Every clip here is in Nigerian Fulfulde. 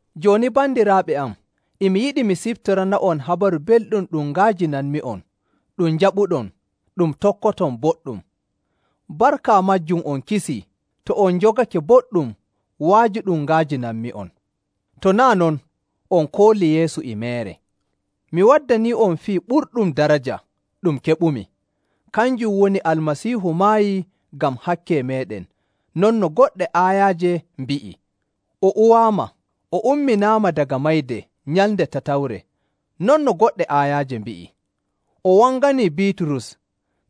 Jooni bandiraaɓe am, e mi yiɗi mi siftorana'on Habaru Belɗum ɗum nga'ajinanmi'on, ɗum njaɓuɗon, ɗum tokkoton boɗɗum. Barka maajum on kisii, to on njogake boɗɗum wa'aju ɗum nga'ajinanmi'on. To naa' non, on koolii Yeesu e meere. Mi waddanii'on fii ɓurɗum daraja ɗum keɓumi. Kanjum woni Almasiihu maayii ngam hakke meeɗen non no goɗɗe aayaaje mbi'i, o uwaama, o umminaama daga mayde nyalnde tatawre non no goɗɗe aayaaje mbi'i, o wangani Biiturus,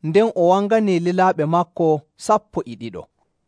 nden o wanganii lilaaɓe maako sappo e ɗiɗo.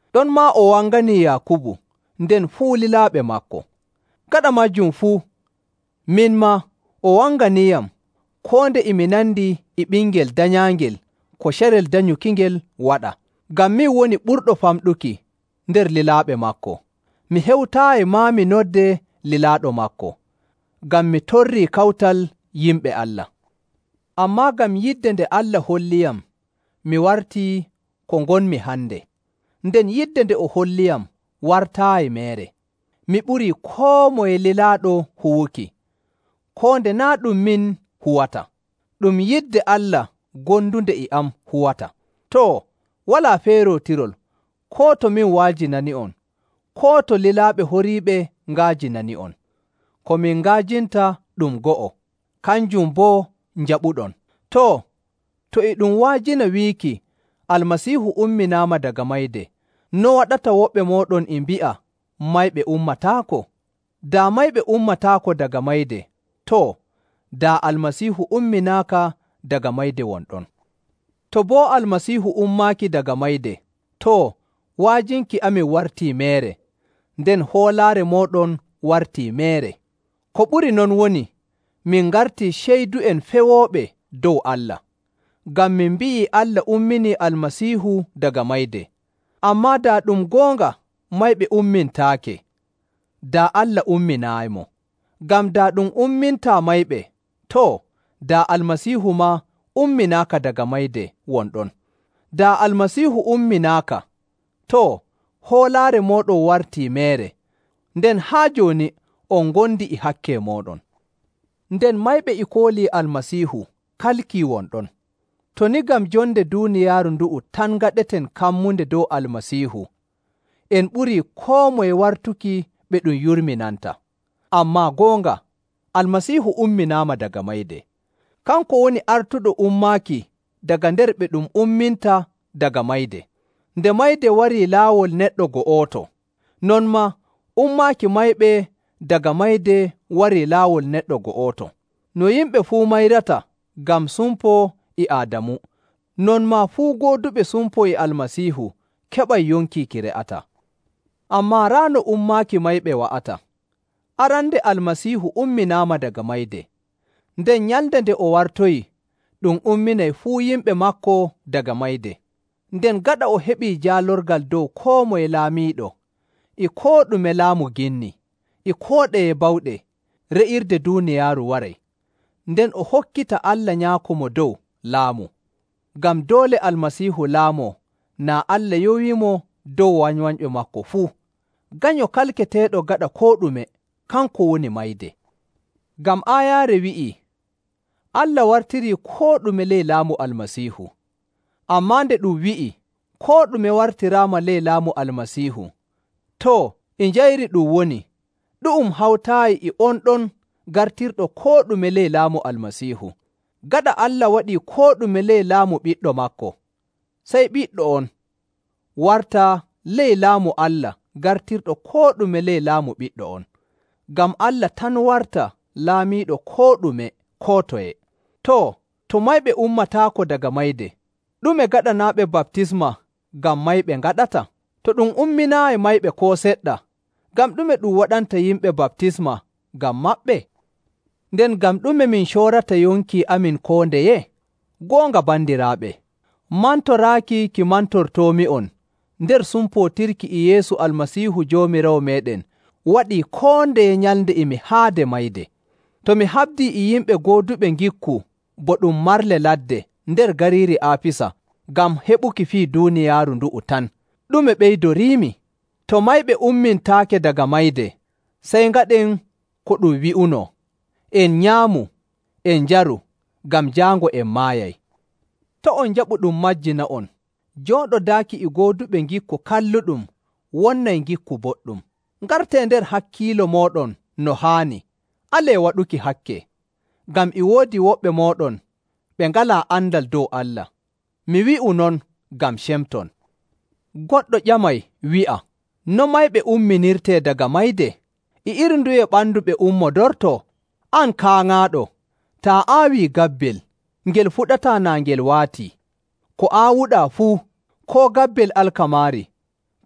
Ɗonmaa o wanganii Yaakubu, nden fuu lilaaɓe maako. Gaɗa maajum fuu, min maa, o wanganiiyam, koo nde e mi nandi e ɓingel danyaangel ko carel danyukingel waɗa. Ngam min woni ɓurɗo famɗuki nder lilaaɓe maako. Mi hewtaayi maa mi noddee lilaaɗo maako, ngam mi torrii kawtal yimɓe Allah. Ammaa ngam yidde nde Allah holliyam mi wartii ko ngonmi hande, nden yidde nde o holliyam wartaayi meere. Mi ɓurii koo moye lilaaɗo huwuki, koo nde naa' ɗum min huwata, ɗum yidde Allah gondunde e am huwata. Too, walaa feerootirol koo to min wa'ajinani'on, koo to lilaaɓe horiiɓe nga'ajinani'on. Ko min nga'ajinta ɗum go'o; kanjum boo njaɓuɗon. Too, to e ɗum wa'ajina wiiki Almasiihu umminaama daga mayde, no waɗata woɓɓe mooɗon e mbi'a mayɓe ummataako? Daa mayɓe ummataako daga mayde, too, daa Almasiihu umminaaka daga mayde won ɗon. To boo Almasiihu ummaaki daga mayde, too, wa'ajinki amin wartii meere, nden hoolaare mooɗon wartii meere. Ko ɓuri non woni, min ngartii ceydu'en fewooɓe dow Allah. Ngam min mbi'ii Allah umminii Almasiihu daga mayde. Ammaa daa ɗum goonga mayɓe ummintaake, daa Allah umminaayimo. Ngam daa ɗum ummintaa mayɓe, too, daa Almasiihu maa umminaaka daga mayde won ɗon. Daa Almasiihu umminaaka, too, hoolaare mooɗon wartii meere, nden haa jooni on ngondi e hakke mooɗon, nden mayɓe e koolii Almasiihu kalkii won ɗon. To ni ngam jonde duuniyaaru ndu'u tan ngaɗeten kammunde dow Almasiihu, en ɓurii koo moye wartuki ɓe ɗum yurminanta. Ammaa goonga Almasiihu umminaama daga mayde. Kanko woni artuɗo ummaaki daga nder ɓe ɗum umminta daga mayde. Nde mayde warii laawol neɗɗo go'oto, non maa ummaaki mayɓe daga mayde warii laawol neɗɗo go'oto. No yimɓe fuu mayrata ngam sumpo e Aadamu, non maa fuu gooduɓe sumpo e Almasiihu keɓay yonki ki re'ataa. Ammaa raa no ummaaki mayɓe wa'ata. Arande Almasiihu umminaama daga mayde, nden nyalnde nde o wartoyi ɗum umminay fuu yimɓe maako daga mayde. Nden gaɗa o heɓii jaalorgal dow koo moye laamiiɗo, e koo ɗume laamu ginni, e koo ɗeye bawɗe, re'irde duuniyaaru waray, nden o hokkita Allah Nyaako Mo Dow laamu. Ngam doole Almasiihu laamoo naa Allah yowiimo dow wanywanyɓe maako fuu. Ganyo kalketeeɗo gaɗa koo ɗume, kanko woni mayde. Ngam aayaare wi'ii, “Allah wartirii koo ɗume ley laamu Almasiihu.” Ammaa nde ɗum wi'i, “Koo ɗume wartiraama ley laamu Almasiihu,” too, e njayri ɗum woni ɗu'um hawtaayi e on ɗon gartirɗo koo ɗume ley laamu Almasiihu. Gaɗa Allah waɗii koo ɗume ley laamu Ɓiɗɗo maako, sey Ɓiɗɗo on warta ley Laamu Allah gartirɗo koo ɗume ley laamu Ɓiɗɗo on, ngam Allah tan warta laamiiɗo koo ɗume koo toye. Too, to mayɓe ummataako daga mayde, ɗume gaɗanaaɓe baptisma ngam mayɓe ngaɗata? To ɗum umminaayi mayɓe koo seɗɗa, ngam ɗume ɗum waɗanta yimɓe baptisma ngam maɓɓe? Nden ngam ɗume min coorata yonki amin koo ndeye? Goonga bandiraaɓe, mantoraaki ki mantortoomi'on nder sumpootirki e Yeesu Almasiihu Joomiraawo meeɗen waɗi koo ndeye nyalnde e mi haade mayde. To mi haɓdii e yimɓe gooduɓe ngikku bo ɗum marle ladde nder gariiri Aafisa ngam heɓuki fii duuniyaaru ndu'u tan, ɗume ɓeydoriimi? To mayɓe ummintaake daga mayde, sey ngaɗen ko ɗum wi'unoo, “En nyaamu, en njaru, ngam jaango en maayay.” To' on njaɓu ɗum majjina'on. “Jooɗodaaki e gooduɓe ngikku kalluɗum wonnay ngikku boɗɗum.” Ngartee nder hakkiilo mooɗon no haani, alee waɗuki hakke, ngam e woodi woɓɓe mooɗon ɓe ngalaa andal dow Allah. Mi wi'u non ngam cemton. Goɗɗo ƴamay wi'a, “No mayɓe umminirtee daga mayde? E iri nduye ɓandu ɓe ummodortoo?” An kaaŋaaɗo! Taa aawii gabbel, ngel fuɗataa naa ngel waatii. Ko aawuɗaa fuu, koo gabbel alkamaari,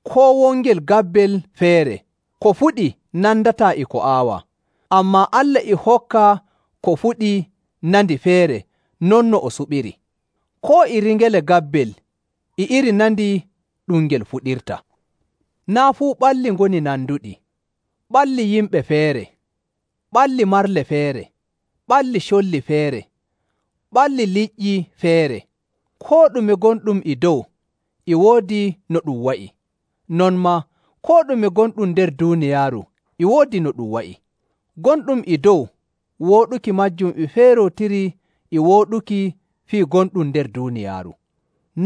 koo wongel gabbel feere, ko fuɗi nandataa e ko aawuɗaa. Ammaa Allah e hokka ko fuɗi nandi feere non no o suɓiri. Koo iri ngele gabbel e iri nandi ɗum ngel fuɗirta. Naa' fuu ɓalli ngoni nanduɗi. Ɓalli yimɓe feere, ɓalli marle feere, ɓalli colli feere, ɓalli liƴƴi feere. Koo ɗume gonɗum e dow e woodi no ɗum wa'i. Non maa koo ɗume gonɗum nder duuniyaaru e woodi no ɗum wa'i. Gonɗum e dow wooɗuki maajum e feerootiri e wooɗuki fii gonɗum nder duuniyaaru.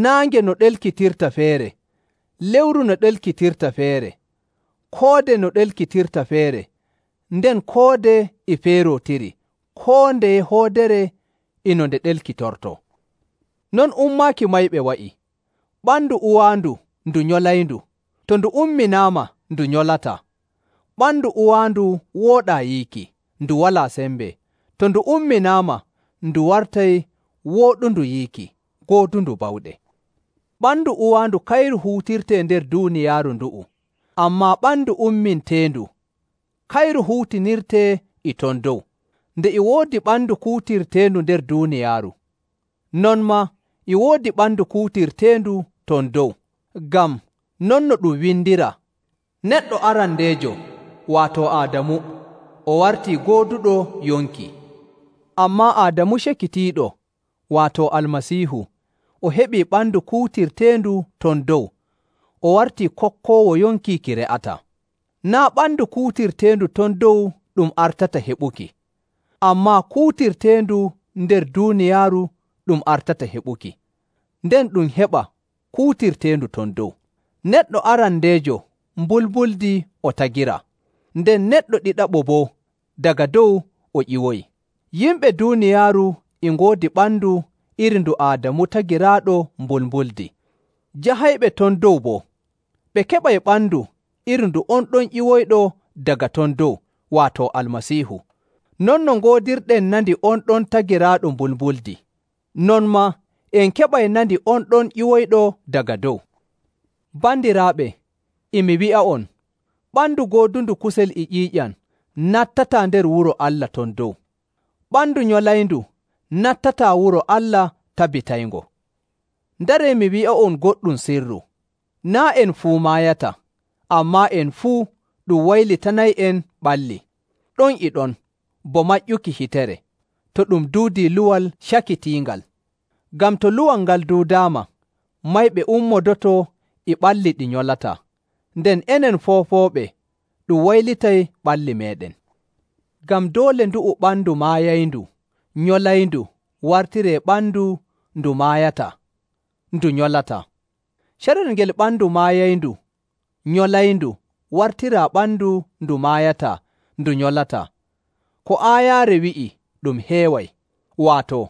Naange no ɗelkitirta feere, lewru no ɗelkitirta feere, koode no ɗelkitirta feere, nden koode e feerootiri koo ndeye hoodere e no nde ɗelkitortoo. Non ummaaki mayɓe wa'i. Ɓandu uwaandu ndu nyolayndu, to ndu umminaama ndu nyolataa. Ɓandu uwaandu wooɗaa yiiki, ndu walaa sembe, to ndu umminaama, ndu wartay wooɗundu yiiki, goodundu bawɗe. Ɓandu uwaandu kayru huutirtee nder duuniyaaru ndu'u, ammaa ɓandu umminteendu, kayru huutinirtee e ton dow. Nde e woodi ɓandu kuutirteendu nder duuniyaaru, non maa e woodi ɓandu kuutirteendu ton dow. Ngam, non no ɗum windiraa, “Neɗɗo arandeejo, waato Aadamu, o wartii gooduɗo yonki.” Ammaa Aadamu cakitiiɗo, waato Almasiihu, o heɓii ɓandu kuutirteendu ton dow, o wartii kokkoowo yonki ki re'ataa. Naa' ɓandu kuutirteendu ton dow ɗum artata heɓuki, ammaa kuutirteendu nder duuniyaaru ɗum artata heɓuki, nden ɗum heɓa kuutirteendu ton dow. Neɗɗo arandeejo mbulmbuldi o tagiraa, nden neɗɗo ɗiɗaɓo boo, daga dow o ƴiwoyi. Yimɓe duuniyaaru e ngoodi ɓandu iri ndu Aadamu tagiraaɗo mbulmbuldi. Jahayɓe ton dow boo, ɓe keɓay ɓandu iri ndu on ɗon ƴiwoyɗo daga ton dow, waato Almasiihu. Non no ngoodirɗen nandi on ɗon tagiraaɗo mbulmbuldi, non maa en keɓay nandi on ɗon ƴiwoyɗo daga dow. Bandiraaɓe, e mi wi'a'on, ɓandu goodundu kusel e ƴiiƴam nattataa nder wuro Allah ton dow. Ɓandu nyolayndu nattataa wuro Allah tabitayngo. Ndaree mi wi'a'on goɗɗum sirru: Naa' en fuu maayata, ammaa en fuu ɗum waylitanay'en ɓalli ɗon e ɗon, bo maƴƴuki hitere, to ɗum duudii luwal cakitiingal. Ngam to luwal ngal duudaama, mayɓe ummodoto e ɓalli ɗi nyolataa, nden enen foofooɓe ɗum waylitay ɓalli meeɗen. Ngam doole ndu'u ɓandu maayayndu nyolayndu wartiree ɓandu ndu maayataa ndu nyolataa. Carel ngel ɓandu maayayndu nyolayndu wartiraa ɓandu ndu maayataa ndu nyolataa, ko aayaare wi'i ɗum heeway, waato,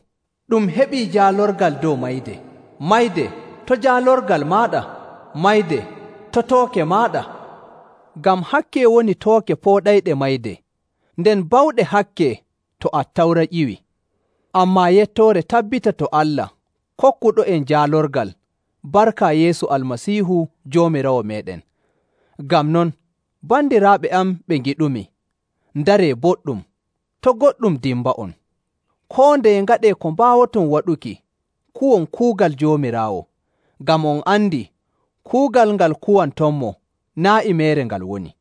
“Ɗum heɓii jaalorgal dow mayde!” “Mayde, to jaalorgal maaɗa? Mayde, to tooke maaɗa?” Ngam hakke woni tooke pooɗayɗe mayde, nden bawɗe hakke to Attawra ƴiwi. Ammaa yettoore tabbita to Allah kokkuɗo'en jaalorgal barka Yeesu Almasiihu Joomiraawo meeɗen. Ngam non, bandiraaɓe am ɓe ngiɗumi, ndaree boɗɗum, to' goɗɗum dimba'on. Koo ndeye ngaɗee ko mbaawoton waɗuki kuwon kuugal Joomiraawo, ngam on andi kuugal ngal kuwantonmo naa' e meere ngal woni.